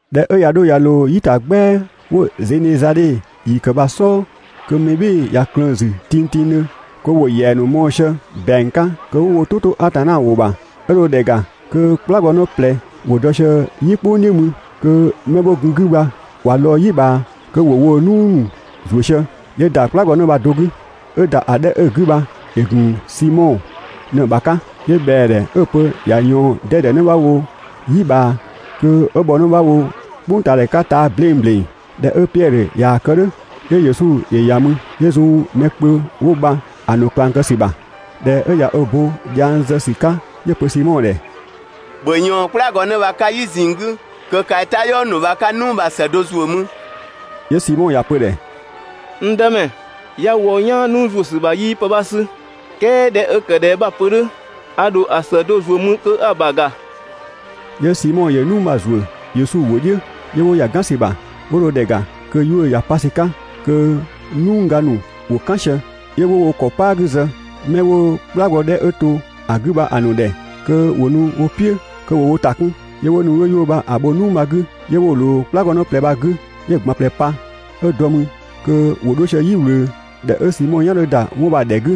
꞊Dhɛ 'ö ꞊ya 'dho ꞊ya ꞊loo "yi ‑ta "gbɛa 'wo‑ Zenezadhe ‑yi ‑kë bha‑ "sɔɔ, kö mɛ "bhɩɩ‑ ꞊ya ꞊klëën‑ ‑zü tingtingdhö kö ‑wo ‑yɛa ‑nu mɔɔ‑ sië ‑bɛang 'ka kö 'wo wo "tʋ 'to Atanna ‑wʋ ‑bha, 'ö dho ‑dhɛ ‑ga kö "kplagɔnë ꞊plɛ ‑wo dɔ sië "yi "kpʋng "dhiʋ̈ mü kö 'mɛ 'wo gun‑ 'gü bha ꞊wa lɔɔ‑ "yi ꞊bhaa kö ‑wo woo‑ "nuu ‑nu "zu sië. 'Yö ‑da "kplagɔnë bha‑ do 'gü, 'ö ‑da ‑a 'dhɛ 'ö‑ 'gü bha ‑yö ‑gun Simɔ ꞊në‑ ‑bha 'ka, 'yö ꞊bhɛa ‑dhɛ 'ö‑ pö ‑ya ꞊yɔɔn 'dɛdɛ 'në 'bha wo "yi ꞊bhaa kö 'ö bhɔ 'në 'bha wo "kpʋngtaadhɛ 'ka taa‑ 'bleng ‑bleng. ꞊Dhɛ 'ö Piɛdhö ꞊yaa‑ kë "dhʋ̈, 'yö Yesu ‑yö ‑ya mü 'yö zun mɛ kpö 'wo bha‑ ‑nu ꞊klang kë ‑sü ‑bha. ꞊Dhɛ 'ö ꞊ya ö bo dhiang zë ‑sü 'ka, 'yö‑ pö Simɔ ‑dhɛ: «‑Bhö ꞊yɔɔn "kplagɔnë bha‑ 'ka "yi ꞊zinng 'gü kö kaa‑ i "tayɔɔ ‑nu bha 'ka "nuu bha‑ ‑së do ‑zuö mü.» 'Yö Simɔ ‑ya pö‑ ‑dhɛ: «N Dëmɛ, 'ya wɔ "yaan "nuu ‑zuö ‑sü ‑bha 'yii pë 'bha 'sü, "kɛɛ ꞊dhɛ 'ö ‑kë ꞊dhɛ 'bha‑ pö "dhʋ̈, a ‑dho ‑a ‑së do ‑zuö mü kö 'a‑ ‑bha ‑ga.» 'Yö Simɔ ‑yö "nuu bha‑ ‑zuö Yesu ‑wʋ bha‑ "dhiʋ̈, 'yö 'wo ‑ya ‑a "gan ‑sü ‑bha, 'wo dho ‑dhɛ ‑ga kö 'yuʋ̈‑ ‑ya pa ‑sü 'ka, kö‑ "nuu ga ‑nu ‑wo "kan sië. 'Yö 'wo wo ‑kɔ "paa 'gü zë 'mɛ 'wo "kplagɔ 'dhɛ 'ö to ‑a 'gü bha‑ ‑nu ‑dhɛ kö ‑wo nu wo "piʋ̈ kö ‑wo wo ‑ta 'kun. 'Yö 'wo nu 'wo 'yuʋ̈‑ bha‑ bho "nuu bha‑ 'gü, 'yö 'wo‑ ꞊loo "kplagɔnë ꞊plɛ bha‑ 'gü, 'yö‑ ꞊gban ꞊plɛ pa, 'ö dɔ mü kö ‑wo 'dho sië "yi ꞊wlöö. ꞊Dhɛ 'ö Simɔ "yan 'dhö ‑da 'wɔn bha‑ ‑dhɛ 'gü,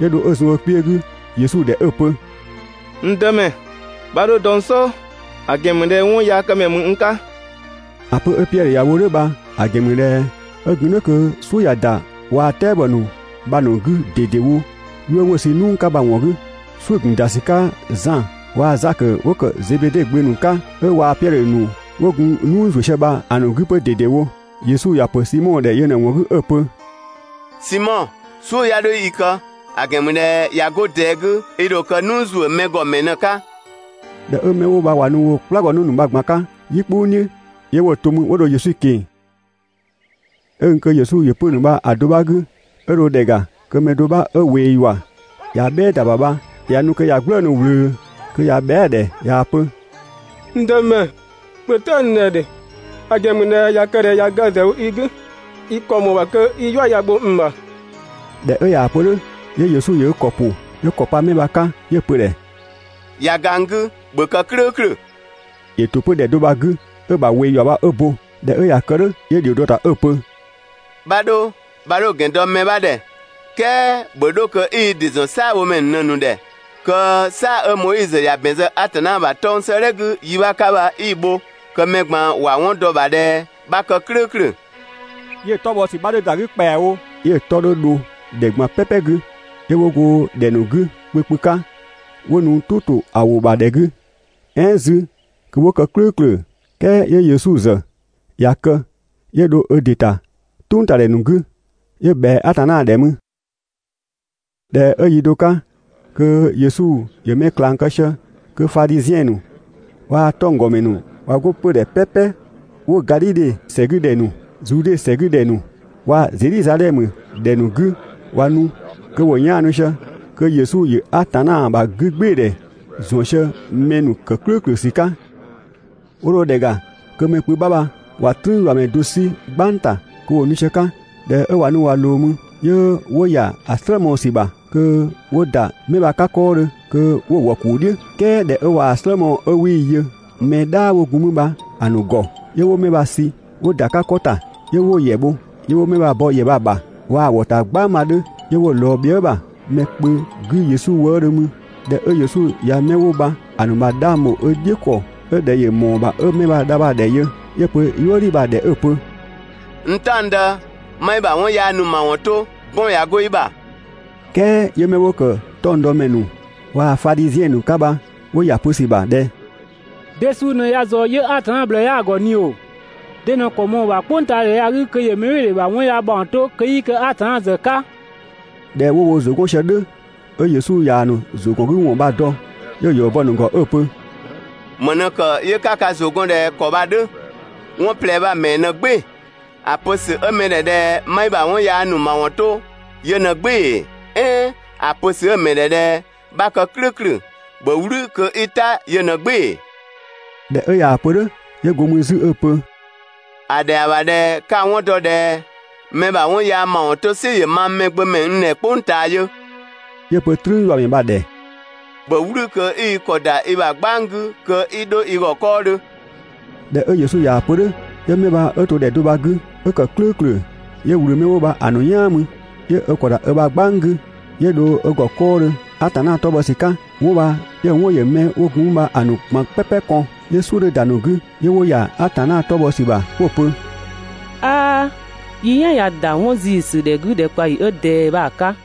'yö dho 'ö zun ö kpiö 'gü Yesu ‑dhɛ 'ö‑ pö: «N Dëmɛ, 'bha 'dho dɔ n "sɔɔ, ‑a ‑gɛn ‑mü ꞊dhɛ 'wɔnyaakëmɛ ‑mü n 'ka.» ‑A pö 'ö Piɛdhö ‑ya wo "dhʋ̈ bha‑ ‑gɛn ‑mü ꞊dhɛ 'ö gun "dhʋ̈ kö "suʋ̈ ꞊ya ‑da waa‑ "tɛabɔ ‑nu bha‑ ‑nu 'gü ꞊dedewo 'yuʋ̈‑ 'wo‑ sü "nuu 'ka bha‑ ‑wɔn 'gü. "Suʋ̈‑ ‑gun ‑da ‑sü 'ka Zan waa‑ Zakö 'wo ‑kë Zebede gbö ‑nu 'ka 'ö waa‑ Piɛdhö ‑nu 'wo gun "nuu ‑zuö sië bha‑ ‑nu 'gü 'pö ꞊dedewo. Yesu ‑ya ‑pö Simɔ ‑dhɛ yö ꞊në‑ ‑wɔn 'gü 'ö‑ pö: «Simɔ, "suʋ̈ 'ya 'dho i kë, ‑a ‑gɛn ‑mü ꞊dhɛ ꞊ya 'go ꞊dɛɛ 'gü, i ‑dho kë "nuu ‑zuö mɛ ‑gɔ ‑mɛ ꞊në‑ 'ka.» ꞊Dhɛ 'ö 'mɛ 'wo bha ꞊wa nu woo‑ "kplagɔnë ‑nu bha‑ ꞊gban 'ka "yi "kpʋng "dhiʋ̈, 'yö 'wo‑ to 'mü 'wo dho Yesu ꞊keng‑. 'Ö gun kö Yesu ‑yö 'pö‑ ‑nu bha‑ do 'bha 'gü, 'ö dho ‑dhɛ ‑ga kö mɛ do 'bha 'ö ꞊wee ‑yua ꞊ya "bhɛɛ ‑da ‑bha bha ꞊ya nu kö ꞊ya "gblëënu‑ ꞊wlöö kö ꞊ya bhɛa" ‑dhɛ ꞊yaa‑ pö: «N Dëmɛ, ‑bhö "ta n ‑dhɛ ‑dhe! ‑A ‑gɛn ‑mü ꞊dhɛ ꞊ya kë ꞊dhɛ ꞊ya ga ‑zë wo i 'gü, i ‑kɔ ‑mɔɔ ‑bha kö 'i "yua ya‑ bho n ‑bha.» ꞊Dhɛ 'ö ꞊yaa‑ pö "dhʋ̈, 'yö Yesu ‑yö ö ‑kɔ ‑pʋ 'yö ‑kɔ pa 'mɛ bha‑ 'ka, 'yö‑ pö‑ ‑dhɛ: «꞊Ya ga n 'gü, ‑bhö kë "klʋ̈ʋ̈klʋ̈!» ‑Yö ‑to 'pö ‑dhɛ do bha‑ 'gü 'ö‑ ‑bha "yua bha 'ö bo. ꞊Dhɛ 'ö ꞊ya kë "dhʋ̈, 'yö ‑dhio dɔ‑ ‑ta 'ö‑ pö: «'Bha 'dho, 'bha 'dho‑ ‑gɛn dɔ mɛ 'bha ‑dhɛ, "kɛɛ ‑bhö 'dho kö 'i i ‑dɩ ‑zɔn "saabhomɛ ‑nu ꞊në‑ ‑nu ‑dhɛ kö "saa‑ 'ö Moizö ‑ya ‑bɛn zë Atanna ‑bha 'tɔng‑ 'sëëdhɛ 'gü yi 'bha 'ka bha 'i‑ bho kö mɛ ꞊gban ‑wa 'wɔn dɔ‑ ‑bha ꞊dhɛ 'bha kë "klʋ̈ʋ̈klʋ̈.» 'Yö‑ 'tɔ bhɔ ‑sü 'bha 'dhö ‑da 'gü ‑kpɛawo, 'yö‑ 'tɔ 'dhö dho ‑dhɛ ꞊gban "pɛpɛ 'gü, 'yö 'wo go ‑dhɛ ‑nu 'gü kpö kpö 'ka 'wo nu "tʋ ‑to ‑a ‑wʋ ‑bha ‑dhɛ 'gü, "ɛɛn 'zü kö 'wo kë "klʋ̈ʋ̈klʋ̈; "kɛɛ 'yö Yesu ‑zë ꞊ya kë 'yö dho ö ‑dɩ ‑ta "tʋngtadhɛ ‑nu 'gü 'yö ꞊bhɛa Atanna ‑dhɛ mü. ꞊Dhɛ 'ö yi do 'ka kö Yesu ‑yö mɛ ꞊klang kë sië, kö Fadhiziɛn ‑nu waa‑ 'tɔnggɔmɛ ‑nu ꞊wa 'go 'pödhɛ "pɛpɛ 'wo Gadhidhe ‑sɛ 'gü ‑dhɛ ‑nu, Zude ‑sɛ 'gü ‑dhɛ ‑nu waa‑ Zedhizadhɛmö ‑dhɛ ‑nu 'gü ꞊wa nu, kö ‑wo 'yaanu sië kö Yesu ‑yö Atanna ‑bha 'gügbɩɩdhɛ ‑zɔn sië mɛ ‑nu ‑kë "klʋ̈ʋ̈klʋ̈ ‑sü 'ka, 'wo dho ‑dhɛ ‑ga kö mɛ kpö 'bha bha ꞊wa "trüünyuamɛ do 'sü "gbang ‑ta kö ‑wo nu sië‑ 'ka. ꞊Dhɛ 'ö ꞊wa nu ꞊wa ꞊loo mü, 'yö 'wo ‑ya ‑a "slë mɔɔ‑ ‑sü ‑bha kö 'wo ‑da 'mɛ bha‑ 'ka 'kɔɔdhö kö 'wo‑ wɔ‑ ‑kuu "dhiʋ̈. "Kɛɛ ꞊dhɛ 'ö ꞊waa‑ "slë mɔɔ‑ 'ö 'wii‑ yö mɛ "dhaa 'wo gun 'mü bha‑ ‑nu ‑gɔ, 'yö 'wo 'mɛ bha‑ sü 'wo ‑da 'ka 'kɔ ‑ta, 'yö 'wo‑ ‑yɛ bho, 'yö 'wo 'mɛ bha‑ bɔ ‑yɛ bha‑ ‑bha waa‑ ‑wɔ ‑ta "gbang bha‑ 'dhö, 'yö 'wo‑ ꞊lɔɔ bhiëga ‑bha mɛ kpö 'gü Yesu wëëdhö mü. ꞊Dhɛ 'ö Yesu ꞊ya 'mɛ 'wo bha‑ ‑nu ‑bha 'dhang ‑bho ö "dhiʋ̈ ‑kɔ ('ö ꞊dhɛ ‑yö ‑mɔɔ ‑bha 'ö 'mɛ bha‑ dha) bha‑ ‑dhɛ yö, 'yö‑ pö "yuëdhi bha‑ ‑dhɛ 'ö‑ pö: «N "taɔngdë, 'ma i ‑bha 'wɔn yaa ‑nu ‑mawɔn to, 'bɔn ꞊ya 'go i ‑bha!» "Kɛɛ 'yö 'mɛ 'wo ‑kë 'tɔngdɔmɛ ‑nu waa‑ Fadhiziɛn ‑nu 'ka bha 'wo ‑ya ‑a pö ‑sü ‑bha ꞊dhɛ: «De suu ꞊në ya ꞊zɔɔ 'yö Atanna ꞊bhlëë 'yaa ‑gɔ ꞊ni ‑oo? De ꞊në‑ ‑kɔ ꞊mɔɔ‑ ‑bha "kpʋngtaadhɛ ya‑ 'gü kö ‑yö mɛbhɩɩdhe ‑bha 'wɔn yaa ‑mawɔn 'to kö 'yii kë Atanna ‑zë 'ka?» ꞊Dhɛ 'wo wo ‑zʋ 'gɔn sië "dhʋ̈, 'ö Yesu ꞊yaa‑ ‑nu ‑zʋgɔngüwɔn bha‑ dɔ, 'yö‑ ‑yɔ bɔ‑ ‑nu ‑gɔ 'ö‑ pö: «‑Më ꞊në ‑kë 'yö 'ka ka ‑zʋ gɔn ꞊dhɛ ‑kɔ bha‑ 'dhö? 'Wɔn ꞊plɛ bha‑ ‑mɛɛ ꞊në "gbɩɩ‑? ‑A pö ‑sü 'ö mɛ ‑dhɛ ꞊dhɛ 'ma i ‑bha 'wɔn yaa ‑nu ‑mawɔn 'to yö ꞊në "gbɩɩ‑ ‑ee, "ɛɛn ‑a pö ‑sü 'ö‑ ‑mɛ ‑dhɛ ꞊dhɛ 'bha kë "klʋ̈ʋ̈klʋ̈, ‑bhö "wlü kö 'i "ta yö ꞊në "gbɩɩ‑ ‑ee?» ꞊Dhɛ 'ö ꞊yaa‑ pö "dhʋ̈, 'yö go mü 'zü 'ö‑ pö: «‑A ‑dhɛa ‑bha ꞊dhɛ 'ka‑ 'wɔn dɔ ꞊dhɛ mɛ ‑bha 'wɔn yaa ‑mawɔn 'to "sɩ ‑yö mang Mɛgbömɛ n ‑dhɛ "kpʋng ꞊taa yö. 'Yö‑ pö "trüünyuamɛ bha‑ ‑dhɛ: «‑Bhö "wlü kö 'i i ‑kɔ ‑da i ‑bha "gbang 'gü kö 'i 'dho i ‑gɔ 'kɔɔdhö!» ꞊Dhɛ 'ö Yesu ꞊yaa‑ pö "dhʋ̈, 'yö 'mɛ bha 'ö to ‑dhɛ do bha‑ 'gü 'ö ‑kë "klʋ̈ʋ̈klʋ̈, 'yö ꞊wlü 'mɛ 'wo bha‑ ‑nu "yaan mü 'yö ö ‑kɔ ‑da ö ‑bha "gbang 'gü, 'yö dho ö ‑gɔ 'kɔɔdhö Atanna 'tɔ bhɔ ‑sü 'ka. 'Wɔn bha 'yö‑ 'wɔn ‑yö 'mɛ 'wo gun mü bha‑ ꞊gban "pɛpɛ kɔn, 'yö "suʋ̈ 'dhö ‑da ‑a ‑nu 'gü, 'yö 'wo ‑ya Atanna 'tɔ bhɔ ‑sü ‑bha 'wo‑ pö: «'Aa! Yi "yan ꞊ya ‑da 'wɔn ‑ziisü ‑dhɛ 'gü ‑dhɛkpaɔyi 'ö ꞊dɛɛ bha‑ 'ka!»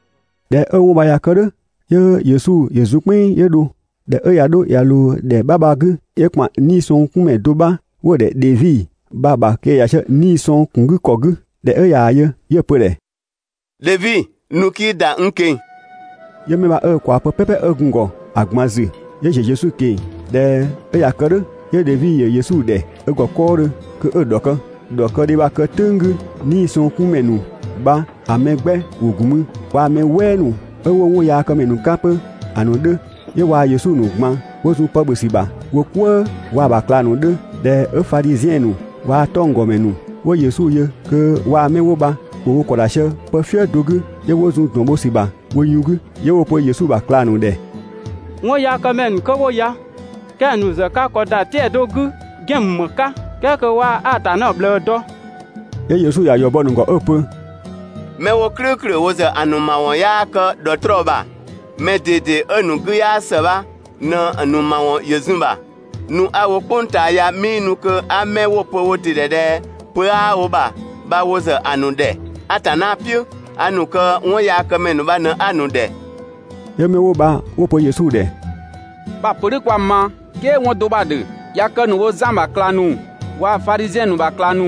꞊Dhɛ 'ö 'wɔn bha ꞊ya kë "dhʋ̈, 'yö Yesu ‑yö zun "kpɛnng 'yö dho. ꞊Dhɛ 'ö ꞊ya 'dho ꞊ya ꞊loo ‑dhɛ 'bha bha‑ 'gü, 'yö ‑kpan 'niisɔngkunmɛ do 'bha 'wo‑ ‑dhɛ Dhevi bha‑ ‑bha kö ‑yö ‑ya sië 'nii‑ sɔng ‑kun 'gü ‑kɔ 'gü. ꞊Dhɛ 'ö ꞊yaa‑ yö 'yö‑ pö‑ ‑dhɛ: «Dhevi, nu 'kii ‑da n ꞊keng‑!» 'Yö 'mɛ bha 'ö ö ꞊kwaa pë "pɛpɛ 'ö gun‑ ‑gɔ ‑a ꞊gban ‑zü 'yö ‑ziö Yesu ꞊keng‑. ꞊Dhɛ 'ö ꞊ya kë "dhʋ̈, 'yö Dhevi ‑yö Yesu ‑dhɛ ö ‑gɔ 'kɔɔdhö kö 'ö‑ ‑dhɔkë. ‑Dhɔkëdhe bha‑ kë "tʋ̈ng 'gü, 'niisɔngkunmɛ ‑nu bha‑ mɛ 'gbɛ ‑wo ‑gun mü waa‑ mɛ "wɛɛ ‑nu 'ö 'wo 'wɔnyaakëmɛ ‑nu 'ka 'pö ‑a ‑nu 'dhö, 'yö waa‑ Yesu ‑nu ꞊gban 'wo zun pë ‑bhö ‑sü ‑bha wo "kwëë waa‑ ‑bha ꞊klang ‑nu 'dhö. ꞊Dhɛ 'ö Fadhiziɛn ‑nu waa‑ 'tɔnggɔmɛ ‑nu 'wo Yesu yö kö waa‑ 'mɛ 'wo bha ‑wo wo ‑kɔ ‑da sië pëfië do 'gü, 'yö 'wo zun ‑dɔn bho ‑sü ‑bha wo yun 'gü, 'yö 'wo‑ pö Yesu ‑bha ꞊klang ‑nu ‑dhɛ: «'Wɔnyaakëmɛ ‑nu 'kö 'wo ya kɛng‑ ‑nu ‑zë ka ‑kɔ ‑da 'tɛa‑ do 'gü ‑gɛn ‑mü ‑më 'ka ("kɛɛ kö 'waa Atanna ꞊bhlëë dɔ).» 'Yö Yesu ‑ya ‑yɔ bɔ‑ ‑nu ‑gɔ 'ö‑ pö: «'Mɛ 'wo "klʋ̈ʋ̈klʋ̈ wo ‑zë ‑a ‑nu ‑mawɔn 'yaa kë ‑dhɔtrɔɔ ‑bha, mɛ ꞊dede 'ö‑ ‑nu 'gü 'yaa ‑së bha ꞊në‑ ‑nu ‑mawɔn ‑yö zun‑ bha. Nu 'a‑ wo "kpʋng ꞊taa ya 'mii nu kö 'a 'mɛ 'wo‑ pö wo ‑dɩ ‑dhɛ ꞊dhɛ pö 'aa wo ‑bha bha wo ‑zë ‑a ‑nu ‑dhɛ Atanna "piʋ̈, a ‑nu kö 'wɔnyaakëmɛ ‑nu bha ꞊në 'a‑ ‑nu ‑dhɛ.» 'Yö 'mɛ 'wo bha 'wo‑ pö Yesu ‑dhɛ: «'Bha‑ pö "dhʋ̈ 'kwa‑ ma, "kɛɛ 'wɔn do 'bha‑ ‑dhö. ꞊Ya kë ‑nu wo Zan ‑bha ꞊klang ‑nu 'waa Fadhiziɛn ‑nu ‑bha ꞊klang ‑nu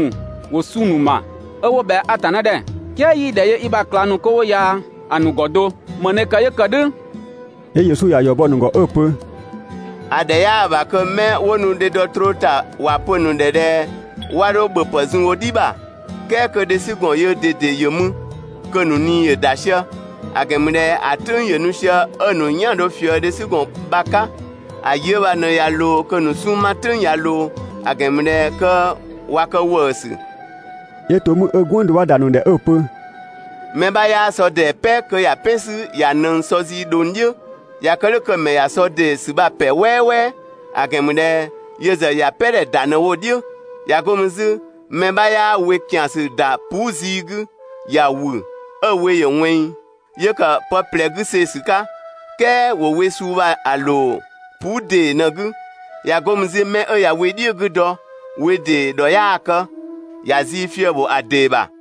‑wo 'sunng‑ ‑nu ‑ma 'ö 'wo ꞊bhɛa Atanna ‑dhɛ, "kɛɛ 'yii‑ ‑dhɛ yö i ‑bha ꞊klang ‑nu 'kö 'wo ya‑ ‑nu ‑gɔ do, ‑më ꞊në ‑kë 'yö ‑kë "dhʋ̈?» 'Yö Yesu ‑ya ‑yɔ bɔ‑ ‑nu ‑gɔ 'ö‑ pö: «‑A ‑dhɛ 'yaa‑ ‑bha kö 'mɛ 'wo nu dhe dɔ troo ‑ta ‑wa pö‑ ‑nu ‑dhɛ ꞊dhɛ 'wa 'dho ‑bhöpë zun wo "dhi ‑bha, "kɛɛ kö dhesügɔn yöö ꞊dede ‑yö mü (kö‑ ‑nu ꞊nii ‑yö ‑da sië). ‑A ‑gɛn ‑mü ꞊dhɛ ‑a "tʋ̈ng ‑yö nu sië 'ö‑ ‑nu "yan‑ dho ꞊fië dhesügɔn bha‑ 'ka, ‑a yi 'ö bha ꞊në ꞊ya ꞊loo kö‑ ‑nu 'sunng‑ 'ma "tʋ̈ng ꞊ya ꞊loo, (‑a ‑gɛn ‑mü ꞊dhɛ kö ꞊wa kë ‑wëësü).» 'Yö to 'mü 'ö "gwënng do ‑da ‑nu ‑dhɛ 'ö‑ pö: «Mɛ 'bha 'yaa sɔ ‑dee "pɛ kö ‑ya "pɛn 'sü ‑ya ꞊nëng sɔ zii ꞊dhong "dhiʋ̈, ꞊ya kë "dhʋ̈ kö‑ ‑mɛ ꞊ya sɔ ‑dee ‑sü bha‑ "pɛ "wɛɛwɛɛ, ‑a ‑gɛn ‑mü ꞊dhɛ yö ‑zë ‑ya "pɛdhɛ ‑da ꞊në‑ wo "dhiʋ̈. ꞊Ya 'go mü 'zü, mɛ 'bha 'yaa we ‑kiansü ‑da puu" zii 'gü, ‑ya ‑wü 'ö‑ we ‑yö ꞊wɛnng, 'yö ‑kë pë ꞊plɛ 'gü see‑ ‑sü 'ka. "Kɛɛ ‑wo we suu bha‑ ‑loo puu" ‑dee ꞊në‑ 'gü. ꞊Ya 'go mü 'zü, 'mɛ 'ö ꞊ya we "dhiʋ̈‑ 'gü dɔ, we ‑dee ‑dhɔ 'yaa‑ kë, ‑ya zii fië‑ ‑bho ‑a ‑dee ‑bha.